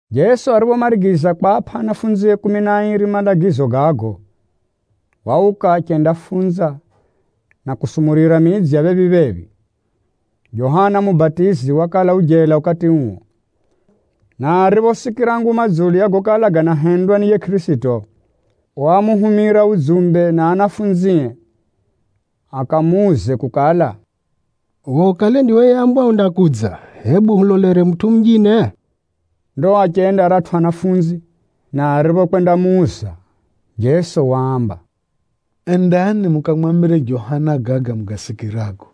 Jeso ariphomarigiza kwapʼa anafunzie kumi na airi malagizo gago, wauka achendafunza, na kusumurira midzi ya phephi-phephi. Johana Mubatizi wakala u jela ukati uo, na ariphosikira nguma dzulu ya gokala ganahendwa ni yiye Kʼirisito, wamuhumira udzumbe na anafunzie akamuuze kukala, “Uwe ukale ndiwe yeambwa undakudza, hebu hulolere mutʼu munjine?” Ndo achenda aratʼu anafunzi, na ariphokwendamuuza, Jeso waamba, “Endani mukamwambire Johana gaga mugasikirago,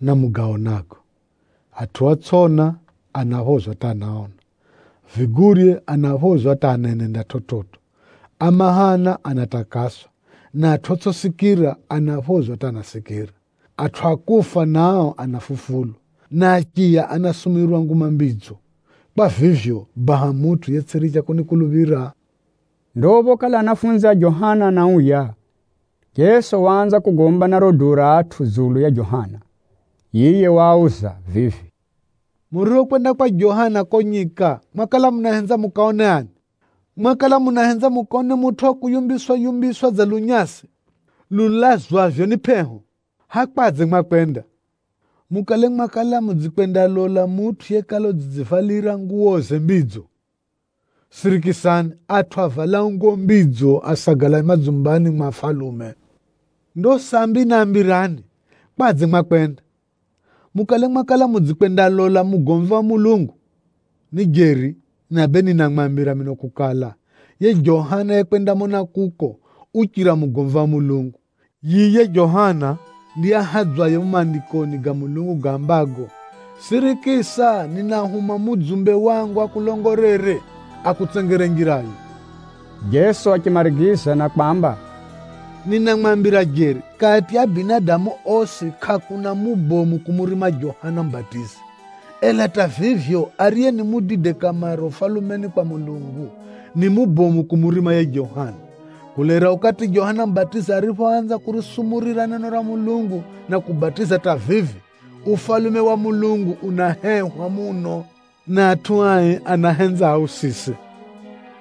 na mugaonago. Atʼu otsʼiona, anaphozwa hata anaona, vigurye anaphozwa hata anenenda chividzo, a mahana anatakaswa, na atʼu otsʼisikira, anaphozwa hata anasikira. Atʼu a kufa nao anafufulwa, na achiya anasumurirwa Nguma Mbidzo. Kwa vivyo, baha mutʼu yetsʼiricha kunikuluphira!” Ndo phokala anafunzi a Johana anauya, Jeso waanza kugomba na riro duu ra atʼu dzulu ya Johana. Yiye waauza vivi, “Muriphokwenda kwa Johana kuko nyika, mwakala munahenza mukaone ani? Mwakala munahenza mukaone mutʼu wa kuyumbiswa-yumbiswa dza lunyasi lulazwavyo ni pʼeho? Hʼaya kwadze mwakwenda? Mukale mwakala mudzikwendalola mutʼu yekala udzidzivalira nguwoze mbidzo? Sirikisani, atʼu avalao nguwo mbidzo, asagala madzumbani mwa afalume! Ndo sambi nambirani, kwadze mwakwenda? Mukale mwakala mudzikwendalola mugomvi wa Mulungu? Ni jeri, na bee ninamwambira mino kukala, yiye Johana yekwendamona kuko, uchira mugomvi wa Mulungu. Yiye Johana ndiye ahadzwaye mumo Maandikoni ga Mulungu gaambago, ‘Sirikisa, ninahuma mudzumbe wangu akulongolere, akakutsengere njirayo.’” Jeso achimarigiza na kwamba, “Ninamwambira jeri, kati ya binadamu osi, kʼakuna mubomu kumurima Johana Mubatizi. Ela hata vivyo, ariye ni mudide kamare Ufalumeni kwa Mulungu, ni mubomu kumurima yiye Johana. Kulaira ukati Johana Mubatizi ariphoanza kurisumurira neno ra Mulungu na kubatiza hata vivi, Ufalume wa Mulungu unahehwa muno, na atʼu ai anahenza ausise.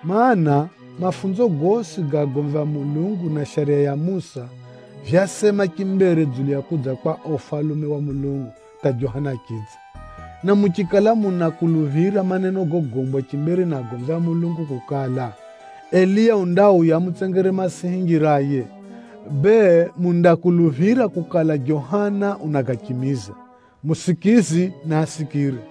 Maana, mafunzo gosi ga agomvi a Mulungu na Shariya ya Musa vyasema chimbere dzulu ya kudza kwa uo Ufalume wa Mulungu hata Johana achidza. Na muchikala munakuluphira maneno gogombwa chimbere ni agomvi a Mulungu kukala, Eliya undauya amutsengere Masihi njiraye, bee mundakuluphira kukala Johana unagachimiza. Musikizi naasikire!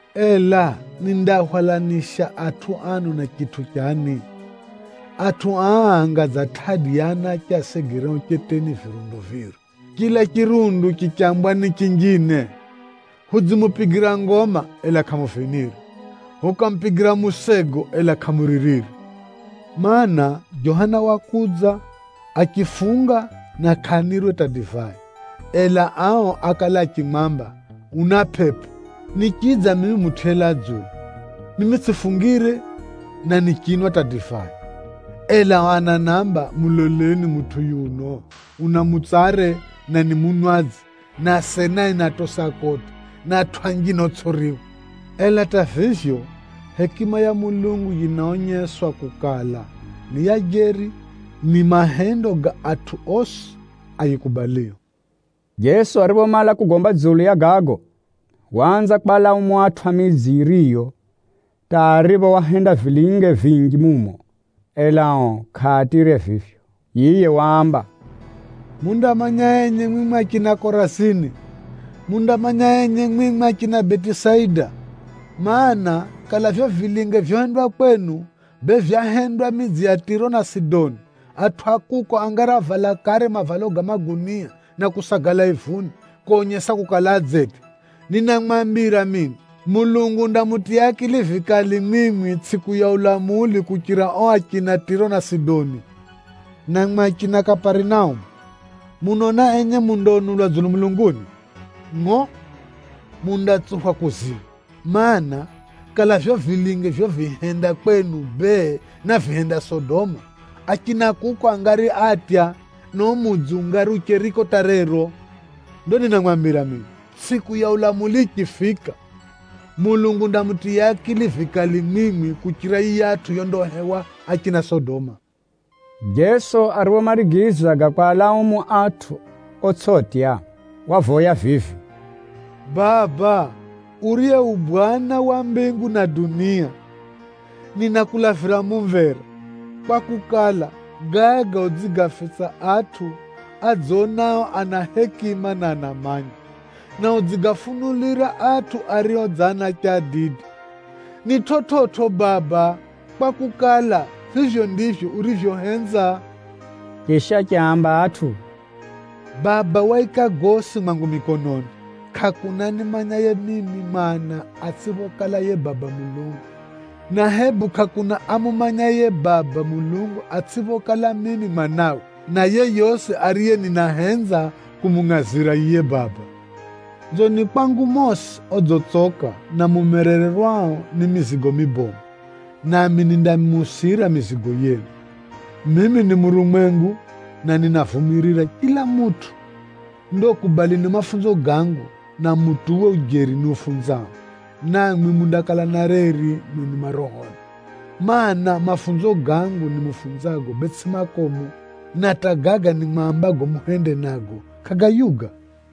“Ela nindaahwalanisha atʼu ano na chitʼu chani? Atʼu aa anga dza tʼadi ya anache asegereo cheteni virundu viri, chila chirundu chichambwa ni chinjine, ‘Hudzimupigira ngoma, ela kʼamuvinire! Hukamupigira musego, ela kʼamuririre!’ Maana, Johana wakudza, achifunga na kʼanirwe hata divai, ela ao ákala achimwamba, ‘Una pʼepʼo!’ Nichidza mimi Mutʼu yelaa dzulu. Mimi tsʼifungire na nichinwa hata divai, ela ao ananamba, ‘Muloleni mutʼu yuno, una mutsare, na ni munwadzi, na asenae ni atosi a kodi, na atʼu anjine otsʼiriwa!’ Ela hata vivyo, hekima ya Mulungu yinaonyeswa kukala ni ya jeri ni mahendo ga atʼu osi ayikubalio.” Jeso ariphomala kugomba dzulu ya gago, waanza kwalaumu atʼu a midzi yiyo, hata aripho wahenda vilinge vinji mumo, ela ao kʼaatyire vivyo. Yiye waamba, “Mundamanya enye mwimwi achina Korazini! Mundamanya enye mwimwi achina Betisaida! Maana, kala vivyo vilinge vyohendwa kwenu, bee vyahendwa midzi ya Tʼiro na Sidoni, atʼu a kuko angari ávala kare mavalo ga magunia na kusagala ivuni, konyesa kukala adzetya. Ninamwambira mino, Mulungu undamutiya akili vikali mwimwi tsʼiku ya ulamuli kuchira ao achina Tʼiro na Sidoni. Na mwimwi achina Kaparinaumu, munaona enye mundaunulwa dzulu mulunguni? Ngʼo! Mundatsuphwa kuzimu! Mana, kakala vivyo vilinge vyovihenda kwenu bee, návihenda Sodoma, achina kuko angari átya, na uo mudzi ungari ucheriko hata rero. Ndo ninamwambira mino, tsʼiku ya ulamuli yichifika, Mulungu undamutiya akili vikali mwimwi kuchira yiyatʼu yondahewa achina Sodoma.” Jeso ariphomarigiza gaga kwalaumu atʼu otsʼitya, wavoya vivi, “Baba, uriye u Bwana wa mbingu na dunia, ninakulavira mumvera, kwakukala, gaga udzigafitsa atʼu adzonao ana hekima na anamanya, na udzigafunulira atʼu ario dza anache adide. Ni chividzo Baba, kwakukala, vivyo ndivyo urivyohenza.” Chisha achiaamba atʼu vivi, “Baba waika gosi mwangu mikononi. Kʼakuna animanyaye mimi Mwana ni ani atsʼiphokala yiye Baba Mulungu, na hebu kʼakuna amumanyaye yiye Baba Mulungu atsʼiphokala mimi Mwanawe, na yeyosi ariye ninahenza kumungʼazira yiye Baba. Nzoni kwangu mosi odzitsoka na mumerererwao ni mizigo mibomu, nami nindamuusira mizigo yenu. Mimi ni murumwengu, na ninavumirira chila mutʼu. Ndo kubalini mafunzo gangu, na mutuwe ujeri niufunzao, Na mwimwi mundakala na reri mwenu marohoni. Maana, mafunzo gangu nimufunzago bee tsʼi makomu, na hata gaga nimwambago muhende nago, kʼagayuga.”